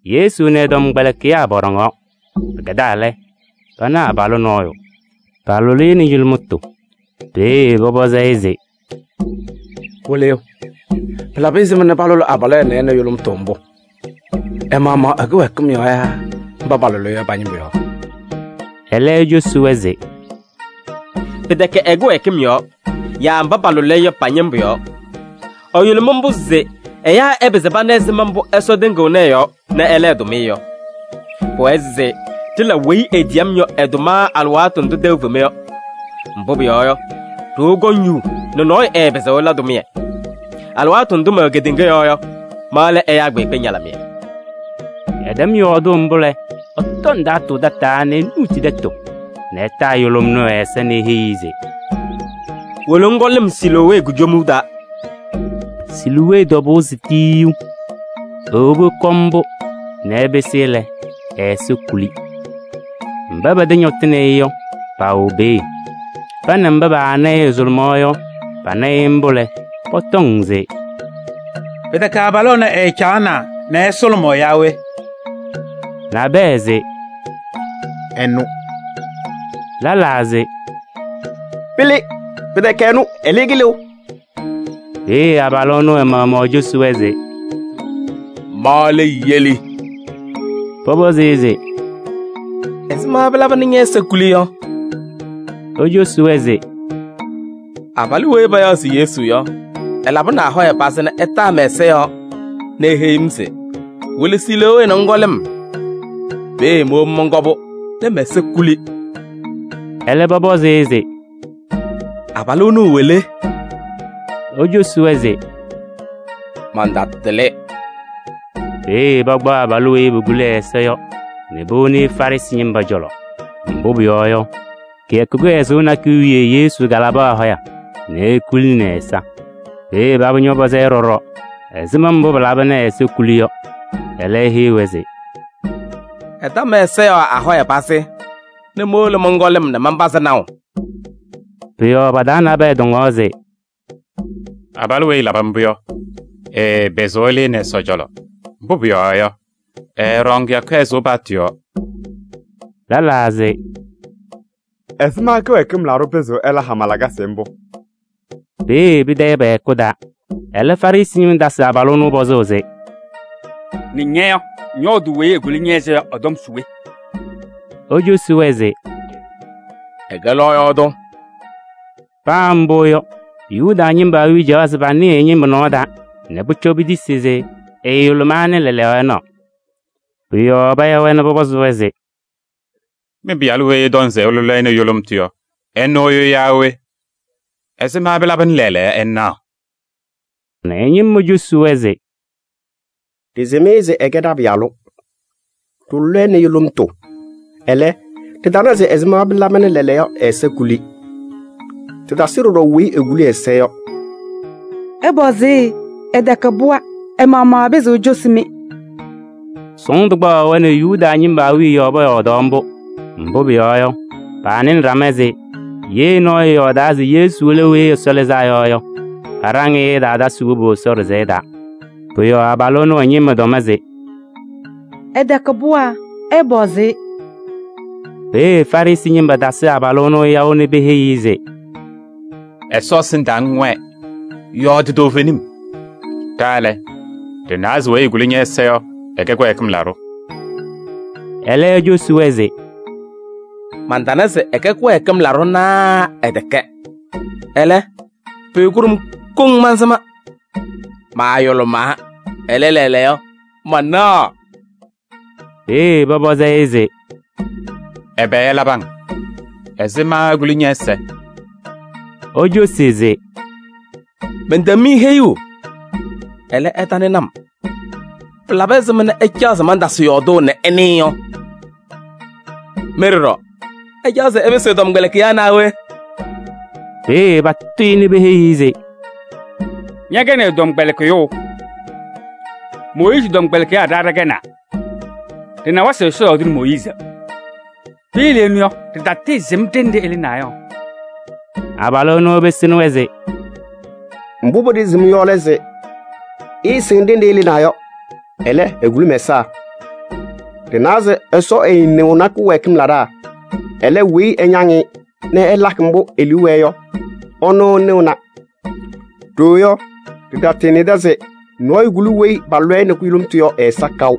Yesu nɛ ɛ-tɔmkpɛlɩkɩyaa pɔɖɔŋaɣ. Pɩkɛdaa lɛ, pana abalʋ nɔɔyʋ, palʋlɩ-ɩ nɛ yʋlʋmtʋ. Peeye pɔpɔzɩ-ɩ se: “Wɩlɩyʋ! Pɩlabɩ ɛzɩma palʋlɩ abalʋ ɛnɛ nɛ yʋlʋmtʋ mbʋ? Ɛ-maɣmaɣ ɛ-kɩwɛɛkɩm yɔɔ yaa mba palʋlɩ-ɩ yɔ pa-ñɩmbʋ yɔɔ?” Ɛlɛ ecosi-wɛ se: “Pɩtɛkɛ ɛ-kɩwɛɛkɩm yɔɔ yaa mba palʋlɩ-ɩ yɔ pa-ñɩmbʋ yɔɔ. Ɛyʋlʋmɩ mbʋ se ɛyaa ɛpɩzɩ pana ɛzɩma mbʋ Ɛsɔ tɩŋɩɣnɩ ɛ-yɔɔ nɛ ɛla ɛ-tʋmɩyɛ yɔ. Pʋwɛɛ se ɖɩla weyi etiyi-m yɔ ɛ-tʋma alɩwaatʋ ndʋ tɛʋ fema yɔ. Mbʋ pʋyɔɔ yɔ, ɖoo kɔŋ yuu nɛ nɔɔyʋ ɛɛpɩzɩɣ ɛla tʋmɩyɛ. Alɩwaatʋ ndʋ mɛwɛ kedeŋa yɔɔ yɔ, ma lɛ ɛyaa kpeekpe ñalɩmɩyɛ.” Ɛtɛm yɔɔdʋʋ mbʋ lɛ, ɛtɔ ndaatʋ tataa nɛ enuuti tɛtʋ nɛ ɛtaa yʋlʋm ɛnʋ ɛ-ɛza nɛ eheyi-i se: “Wolo ŋkɔ lɩm Siloowee kujomuu taa.” Siloowee tɔbʋʋ se Tiyiyu. Ewobi ɛkɔ mbʋ nɛ ɛpɩsɩ lɛ, ɛ-ɛza kuli. Mba pɛ-tɛ ñɔtɩnɩ-ɩ yɔ, paawɛ peeye. Pa nɛ mba paana-ɩ ɛsʋlʋmaɣ yɔ, pana-ɩ mbʋ lɛ, pɔtɔŋ se: “Pɩtɛkɛ abalʋ ɛnɛ ɛɛcaɣna nɛ ɛsʋlʋmʋʋ yaa we?” Nabɛyɛ se: “Ɛnʋ.” Lɛlaa se: “Pɩlɩ! Pɩtɛkɛ ɛnʋ, ɛlɛ, ɛlɩ-ɩ kɩlɩʋ.” Peeye abalʋ ɛnʋ ɛ-maɣmaɣ ecosi-wɛ se: “Ma lɛ yeli.” Pɔpɔzɩ-ɩ se: “Ɛzɩma pɩlaba nɛ ñɛ-ɛza kuli yɔ?” Ecosi-wɛ se: “Abalʋ weyi payaɣ se Yesu yɔ, ɛlabɩnɩ ahɔya pazɩ nɛ ɛtaa mɛ-ɛza yɔɔ nɛ eheyi-m se: ‘Wolo Siloowee nɛ ŋkɔ lɩm.’ Peeye mowobi mɔnkɔ-pʋ nɛ mɛ-ɛza kuli.” Ɛlɛ pɔpɔzɩ-ɩ se: “Abalʋ ɛnʋ ɛwɛ le?” Ecosi-wɛ se: “Mantatɩlɩ.” Peeye pakpaɣ abalʋ weyi pokuli ɛ-ɛza yɔ nɛ powoni Farɩsɩ ñɩma cɔlɔ. Mbʋ pʋyɔɔ yɔ, kɩyakʋ kɩhɛzʋʋ nakʋyʋ wiye Yesu kalabɩ ahɔya nɛ ekulini ɛ-ɛza. Peeye paba ñɔpɔzɩ-ɩ ɖɔɖɔ ɛzɩma mbʋ pɩlaba nɛ ɛ-ɛza kuli yɔ. Ɛlɛ eheyi-wɛ se: “Ɛta mɛ-ɛza yɔɔ ahɔya pazɩ nɛ mowolo mɔnkɔ lɩm nɛ manpazɩ naʋ.” Pʋ-yɔɔ pa-taa nabɛyɛ tɔŋaɣ se: “Abalʋ weyi ɛlabɩ mbʋ yɔ, ɛɛpɩzɩɣ ɛlɩnɩ Ɛsɔ cɔlɔ, mbʋ pʋyɔɔ yɔ, ɛɛɖɔŋ kɩyakʋ kɩhɛzʋʋ paɣtʋ yɔɔ.” Lɛlaa se: “Ɛzɩma kɩwɛɛkɩm laɖʋ pɩzɩɣ ɛla hama lakasɩ mbʋ?” Peeye pɩtayɩ pɛ-hɛkʋ taa. Ɛlɛ Farɩsɩ ñɩma tasɩ pɔzʋʋ abalʋ ɛnʋ se: “Nɛ ña yɔ, ŋyɔɔdʋʋ weyi ekuli ñɛ-ɛza yɔ ɛ-tɔm se we?” Ecosi-wɛ se: “Ɛkɛ lɔɔyaɣ tʋ.” Paa mbʋ yɔ, Yuda ñɩma awiya caɣaɣ se panɩɩ ɛ-ñɩma nɔɔ taa nɛ pʋcɔ petisi se ɛɛyʋlʋmaa nɛ lɛɛlɛɛyɔ ɛnaɣ. Pʋ-yɔɔ paya-wɛ nɛ pɔpɔzɩ-wɛ se: “Mɩ-pɩyalʋ weyi ɩtɔŋ se ɩlʋlɩ-ɩ nɛ yʋlʋmtʋ yɔ, ɛnʋ yɔ yaa we? Ɛzɩma pɩlaba nɛ lɛɛlɛɛyɔ ɛnaɣ?” Ɛ-ñɩma cosi-wɛ se: “Ɖɩsɩm-ɩ se ɛkɛ ɖa-pɩyalʋ, ɖɩlʋlɩ-ɩ nɛ yʋlʋmtʋ. Ɛlɛ, ɖɩtana se ɛzɩma pɩlaba nɛ lɛɛlɛɛyɔ ɛ-ɛza kuli. Ɖɩtasɩ ɖɔɖɔ weyi ekuli ɛ-ɛza yɔ. Ɩpɔzɩ-ɩ, ɛtɛkɛ pɩɣa, ɛ-maɣmaɣ ɛpɩzɩɣ ecosi-mɩ!” Sɔɔndʋ kpaɣaɣ-wɛ nɛ Yuda ñɩma awiya yɔɔ pɔyɔɔdaɣ mbʋ. Mbʋ pʋyɔɔ yɔ, paanɩnɩ ɖama se: “Ye nɔɔyʋ ɛyɔɔdaa se Yesu lɛ Weyi Ɛsɔ Lɩzaa Yɔ yɔ, paɖaŋ-ɩ se ɛtaatasɩ wobu Ɛsɔ ɖɩsɛyɛ taa.” Pʋ-yɔɔ abalʋ ɛnʋ ɛ-ñɩma tɔm se: “Ɛtɛkɛ pɩɣa, ɩpɔzɩ-ɩ!” Peeye Farɩsɩ ñɩma tasɩ abalʋ ɛnʋ yaʋ nɛ peheyi-i se: “Ɛsɔ ɛsɩndaa ŋwɛɛ, yɔɔdɩ toovenim. Ɖa lɛ, ɖɩnawa se weyi ekuli ñɛ-ɛza yɔ, ɛkɛ kɩwɛɛkɩm laɖʋ.” Ɛlɛ ecosi-wɛ se: “Mantana se ɛkɛ kɩwɛɛkɩm laɖʋ naa ɛtɛkɛ. Ɛlɛ, pʋyʋ kʋɖʋm mansɩma: maayʋlʋmaa, ɛlɛ, lɛɛlɛɛyɔ manaɣ.” Peeye pɔpɔzɩ-ɩ se: “Ɛbɛ ɛlabɩ-ŋ? Ɛzɩma ekuli ñɛ-ɛza?” Ecosi se: “Mɛntɛm-mɩ heyuu, ɛlɛ ɩtanɩnɩ-m. Pɩlabɩ ɛzɩma nɛ ɩcaɣ se mantasɩ yɔɔdʋʋ nɛ ɩnɩɩ yɔ? Mɩ ɖɔɖɔ, ɩcaɣ se ɩpɩsɩ ɛ-tɔmkpɛlɩkɩyaa naa we?” Peeye patʋ-ɩ nɛ peheyi-i se: “Ñɛkɛnɩ ɛ-tɔmkpɛlɩkɩyʋ! Mooyiizi tɔmkpɛlɩkɩyaa ɖa ɖɛkɛnaa. Ɖɩnawa se Ɛsɔ yɔɔdɩnɩ Mooyiizi. Piyele ɛnʋ yɔ, ɖɩtatɩɩsɩm ɖenɖe ɛlɩnaa yɔ!” Abalʋ ɛnʋ ɛpɩsɩnɩ-wɛ se: “Mbʋ pɩɖɩɣzɩɣ-m yɔ lɛ se: ɩɩsɩŋ ɖenɖe ɛlɩnaa yɔ, ɛlɛ, ekuli mɛ-ɛza! Ɖɩnawa se Ɛsɔ ɛɛnɩɣnɩ kɩwɛɛkɩm laɖaa, ɛlɛ, weyi ɛñaŋ-ɩ nɛ ɛlakɩ mbʋ e-liu wɛɛ yɔ, ɛnʋ ɛnɩɣna. Ɖooo yɔ, ɖɩtanɩdɩ se nɔɔyʋ kuli weyi palʋlɩ-ɩ nɛ yʋlʋmtʋ yɔ ɛ-ɛza kaʋ.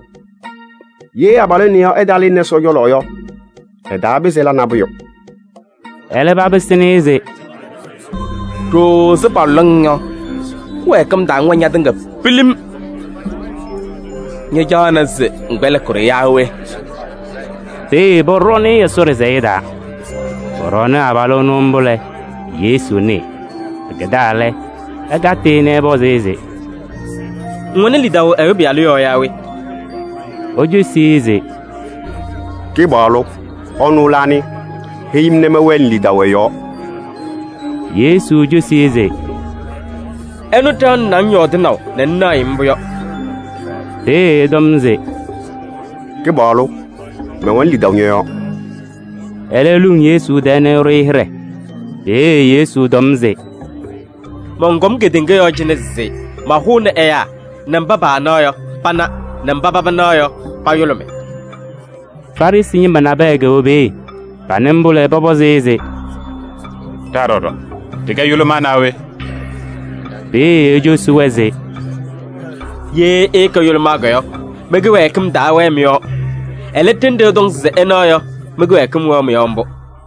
Ye abalʋ ɛnɛ ɛtaalɩnɩ Ɛsɔ cɔlɔ yɔ, ɛtaapɩzɩ ɛla nabʋyʋ.” Ɛlɛ papɩsɩnɩ-ɩ se: “Ɖooo ɛzɩ palʋlʋʋ-ŋ yɔ, kɩwɛɛkɩm taa ŋwɛ ñatɩŋa pilim. Ñacaɣnɩ se ŋkpɛlɩkɩ-ɖʋ yaa we?” Peeye pɔɖɔɔnɩ-ɩ Ɛsɔ ɖɩsɛyɛ taa. Pɔɖɔɔnɩ abalʋ ɛnʋ mbʋ lɛ, Yesu nɩɩ. Pɩkɛdaa lɛ, ɛkatɩ-ɩ nɛ ɛpɔzɩ-ɩ se: “Ŋwɛnɩ lidaʋ Ɛyʋ Pɩyalʋ yɔɔ yaa we?” Ecosi-i se: “Kɩpaɣlʋ! Ɛnʋ lɛ anɩ? Heyi-m nɛ mɛwɛnɩ lidaʋ ɛ-yɔɔ.” Yesu cosi-i se: “Ɛnʋ ɖaɣnɩnɩ-ŋ yɔɔdɩnaʋ nɛ ŋnaɣ-ɩ mbʋ yɔ.” Peeye ɛtɔm se: “Kɩpaɣlʋ! Mɛwɛnɩ lidaʋ ñɔ-yɔɔ.” Ɛlɛ eluŋ Yesu tɛɛ nɛ ɛɖʋ-ɩ hɩɖɛ. Peeye Yesu tɔm se: “Mɔnkɔm kedeŋa yɔɔ cɩnɛ se mahʋnɩ ɛyaa nɛ mba paanaɣ yɔ, pana nɛ mba paba naɣ yɔ, payʋlʋmɩ.” Farɩsɩ ñɩma nabɛyɛ kɛwɛ peeye. Panɩ mbʋ lɛ, pɔpɔzɩ-ɩ se: “Ɖa ɖɔɖɔ ɖɩkɛ yʋlʋmaa naa we?” Peeye ecosi-wɛ se: “Ye ɩɩkɛ yʋlʋmaa yɔ, mɩ-kɩwɛɛkɩm taawɛɛ mɩ-yɔɔ. Ɛlɛ, ɖenɖe ɩtɔŋ se ɩnaɣ yɔ, mɩ-kɩwɛɛkɩm wɛɣ mɩ-yɔɔ mbʋ.”